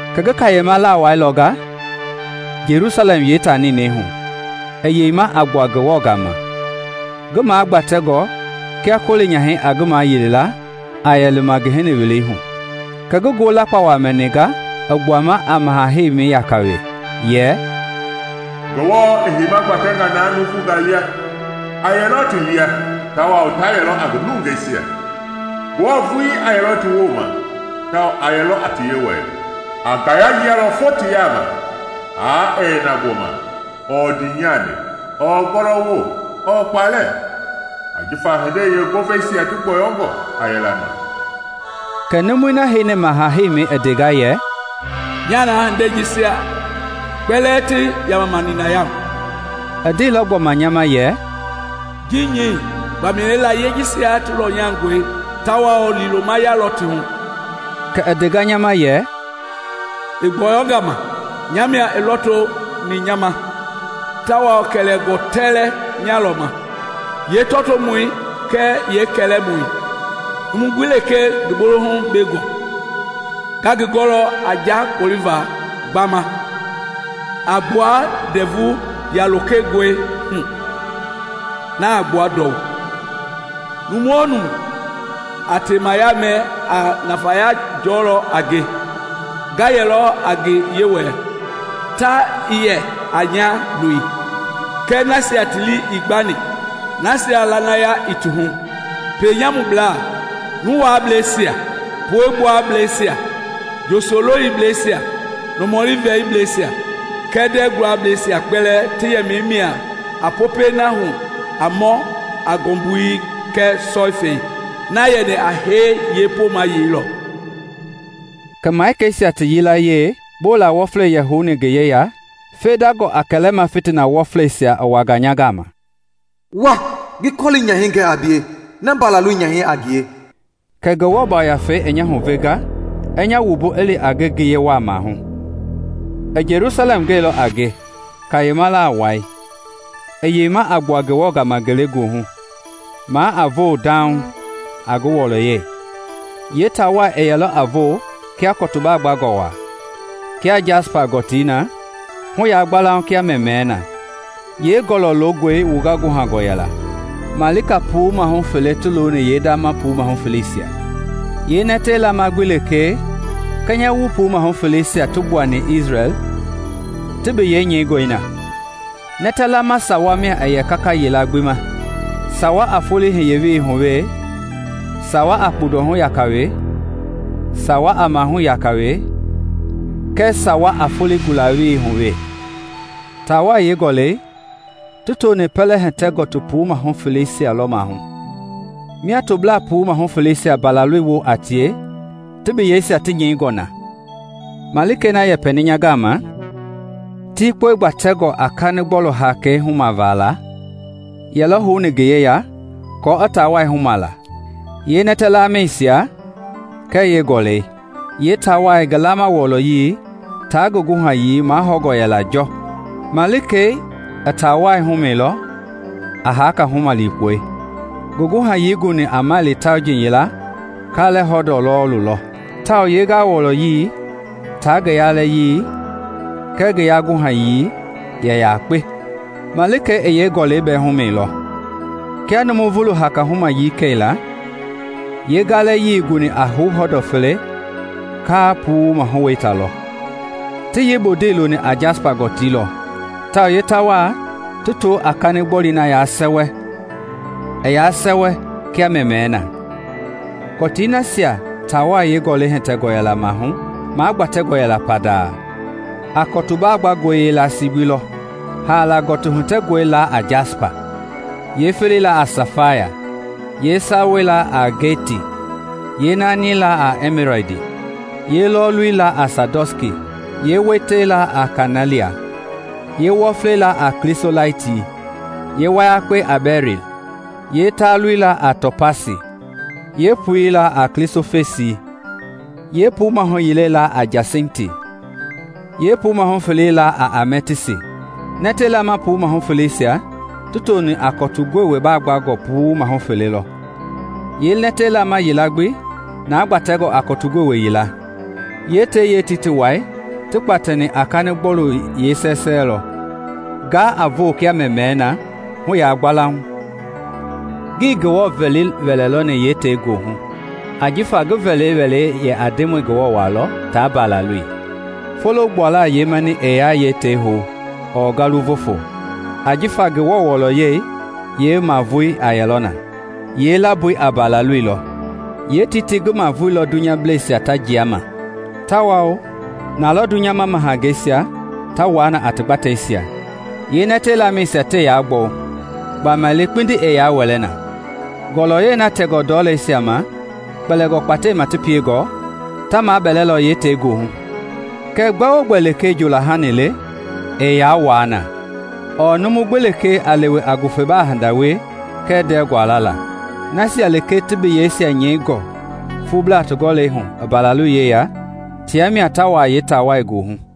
Kɛ ngi kayema lawai lɔnga, Jelusalɛm yeetaa ninɛi hu, i yeima a gbua Ngewɔ gama, ngi magbatɛngɔ kia koli nyahɛi a ngi mayili a yɛ lima ngi hini welei hu. Kɛ ngi ngoo lakpawa mɛninga i gbuama a maha-heimɛi yaka we, yɛ: “Ngewɔ i heima gbatɛnga na nuuvunga lia! A yɛlɔ ti lia, tawao ta yɛlɔ a ngi nungeisia. Ngewɔ vuii a yɛlɔ ti woma, tawao a yɛlɔ a ti Yewɔi. A ngaya yialɔ fo ti yaama, haa ɛɛ yɛ na gbɔma, ɔɔ ndiinyani, ɔɔ gɔlɔwo, ɔɔ kpalɛ, ajifa hindei yeengoveisia ti gbɔyɔngɔ a yɛla ma.” Kɛ numui na heini maha-heimɛi i ndenga yɛ, “Nyaa na hindeisia kpɛlɛɛ ti yamama ninaya hu!” I ndeilɔ gbɔma nya ma yɛ, “Ji nyɛi, gbamaile layie jisia ti lɔnyangɔi tawao liilomaya lɔ ti hu.” Kɛ i ndea nya ma yɛ, “I gbɔyɔnga ma! Nya mia i lɔtoni nya ma tawao kɛlɛngɔ tɛlɛ nyalɔ ma, yeetɔtoomɔi kɛɛ yeekɛlɛmamɔi. Numu gbi lekee ngi bolohu bengɔ, nga ngi ngɔlɔ a nja kpoliva gbama a gbua ndɛvu yalokengɔihu a gbua ndɔu. Nu-o-nu a temaya mɛ a nafaya jɔlɔ a nge: Nga yɛlɔ a ngi Yewɔɛi, ta i yɛ a nya lo. Kɛɛ nasia ti lii ii gbani, nasia lanaya ii ti hu, pienyamublaa, nuwaableisia, puegbuableisia, njosololibleisia, nɔmɔli vɛlibleisia kɛɛ ndɛɛ guableisia kpɛlɛɛ ti yɛmɛi mia a popɛi na hu a mɔ a ngɔmbui kɛɛ sɔifɛi, na yɛni a hee yeepomayei lɔ.” Kɛ malikeisia ti yilayee bola wɔflei yɛ houni ngi yeya fendangɔ a kɛlɛma fitina wɔfleisia i wanga nya gama, yɛ nya ma, “Wa ngi kɔli nyahɛi gɛ a bie, na Mbalaloi nyahɛi a ngie.” Kɛ Ngewɔ Yafei nya huvenga i nya wumbu i li a nge ngiye wa maahu. I Jelusalɛm gɛilɔ a nge, kayema lawai, i yeima a gbua Ngewɔ gama ngelegoohu, maa a voo dauŋ a ngi wɔlɔyɛi. Yeetaawai yɛlɔ a voo kia kɔtu baagbangɔ wa, kia jasipa gɔtii na, hu yagbalauŋ kia mɛmɛɛ na. Yee gɔlɔ loongɔi wunga guhangɔ yɛla, malika puu mahu fele ti looni yeendama puu mahu feleisia. Yeenɛtɛ laama gbi lekee kɛnyɛwu puu mahu feleisia ti gbuani Isrɛl ti biyei nyɛingɔi na. Nɛtɛ laama sawa mia yɛ kaka yila gbi ma: sawa a foloi hiye welei hu we, sawa a kpundɔhu yaka we, sawa a mahui yaka we, kɛɛ sawa a foloi gula welei hu we. Taawai yeegɔlɔi ti tooni pɛlɛ hitɛ gɔtii puu mahu feleisia lɔ maahu, mia toblaa puu mahu feleisia Mbalaloi woo a tie ti biyeisia ti nyɛingɔ na. Malikei na yɛpɛni nya gama tikpɔi kpatɛngɔ a kanigbɔlui hakei humavala yɛlɔ houni ngi yeya kɔɔ i taawai humala, yeenɛtɛ lamɛisia, kɛɛ yeegɔlɔi. Yeetaawai ngi laama wɔlɔyii taa ngi guhayii mahɔngɔ yɛla jɔ. Malikei i tawai humɛilɔ a haka huma likpɔi: Ngi guhayii i guni a maili tauji yila kalɛ hɔndɔ lɔɔlu lɔ, tawao yeengawɔlɔyii taa ngi yalɛyii kɛɛ ngii yaguhayii yɛ yakpe. Malikei i yeegɔlɔi bɛɛ humɛilɔ, kia nuuvu haka humayii kɛila, yeengalɛyii guni a hou hɔndɔ fele kalɛ puu mahu weita lɔ. Ti yeebundei looni a jasipa gɔtii lɔ tawao yeetaawai ti too a kanigbɔu na ya sɛwɛ, i yaa sɛwɛ kia mɛmɛɛ na. Kɔti nasia taawai yeegɔlɔi hitɛngɔ yɛla maahu magbatɛngɔ yɛla pandaa a kɔti baagbangɔi yeelasii gbi lɔ. Haala gɔtii hitɛngɔi laa a jasipa, yeefelei a safaya, yeesawei ageti, yeenaani a ɛmiladi, yeelɔɔlu a sadɔnski, yeeweite a kanɛlia, yeewɔflei a klisolaiti, yeewayakpei a bɛril, yee taalui a topasi, yee pui a klisoflesi; yeepuu mahu yile laa a jasinti, yee puu mahu felei a amɛtisti. Nɛtɛ laama puu mahu feleisia ti tooni a kɔtu gowe baagbangɔ puu mahu fele lɔ, yeenɛtɛ laama yila gbi na gbatɛngɔ a kɔtu gowe yila. Yeetei yeetiitii wai ti kpatɛni a kani gbɔu yeesɛsɛ lɔ, nga a voo kia mɛmɛɛ na hu yaagbalauŋ. Ngii Ngewɔ vɛli wɛlɛ lɔni yeetei goohu, ajifa ngi vɛli wɛlei a Ndemɔi Ngewɔ walɔ taa Mbalaloi. Folo gbuala yeemani ɛɛ yaa yeetei hou ɔɔ ngawu voofo, ajifa Ngewɔ wɔlɔyɛi yeemavoi a yɛlɔ na, yeelamboi a Mbalaloi lɔ. Yeetei ngi mavoi lɔ dunyableisia ta jia ma tawao nalɔ dunyama mahangeisia ta wuaa na a ti gbateisia. Yeenɛtɛ lamɛisia tɛɛ yaa gbɔwu, gbamaile kpindi ɛɛ yaa wɛlɛna. Ngɔlɔyɛi na tɛngɔ ndɔleisia ma kpɛlingɔ kpatɛima ti piengɔ ta mabelɛlɔ yeetei goohu. Kɛɛ gbɛ-o-gbɛ lekee njoola hani le ɛɛ yaa wuaa na, ɔɔ numu gbi lekee a lewe a ngufebaa hindangaa wie kɛɛ ndɛɛ guala. Nasia lekee ti biyeisia nyɛingɔ fuublaa ti gɔlɛi hu i Mbalaloi yeya tia mia ta wuaa yeetaawai goohu.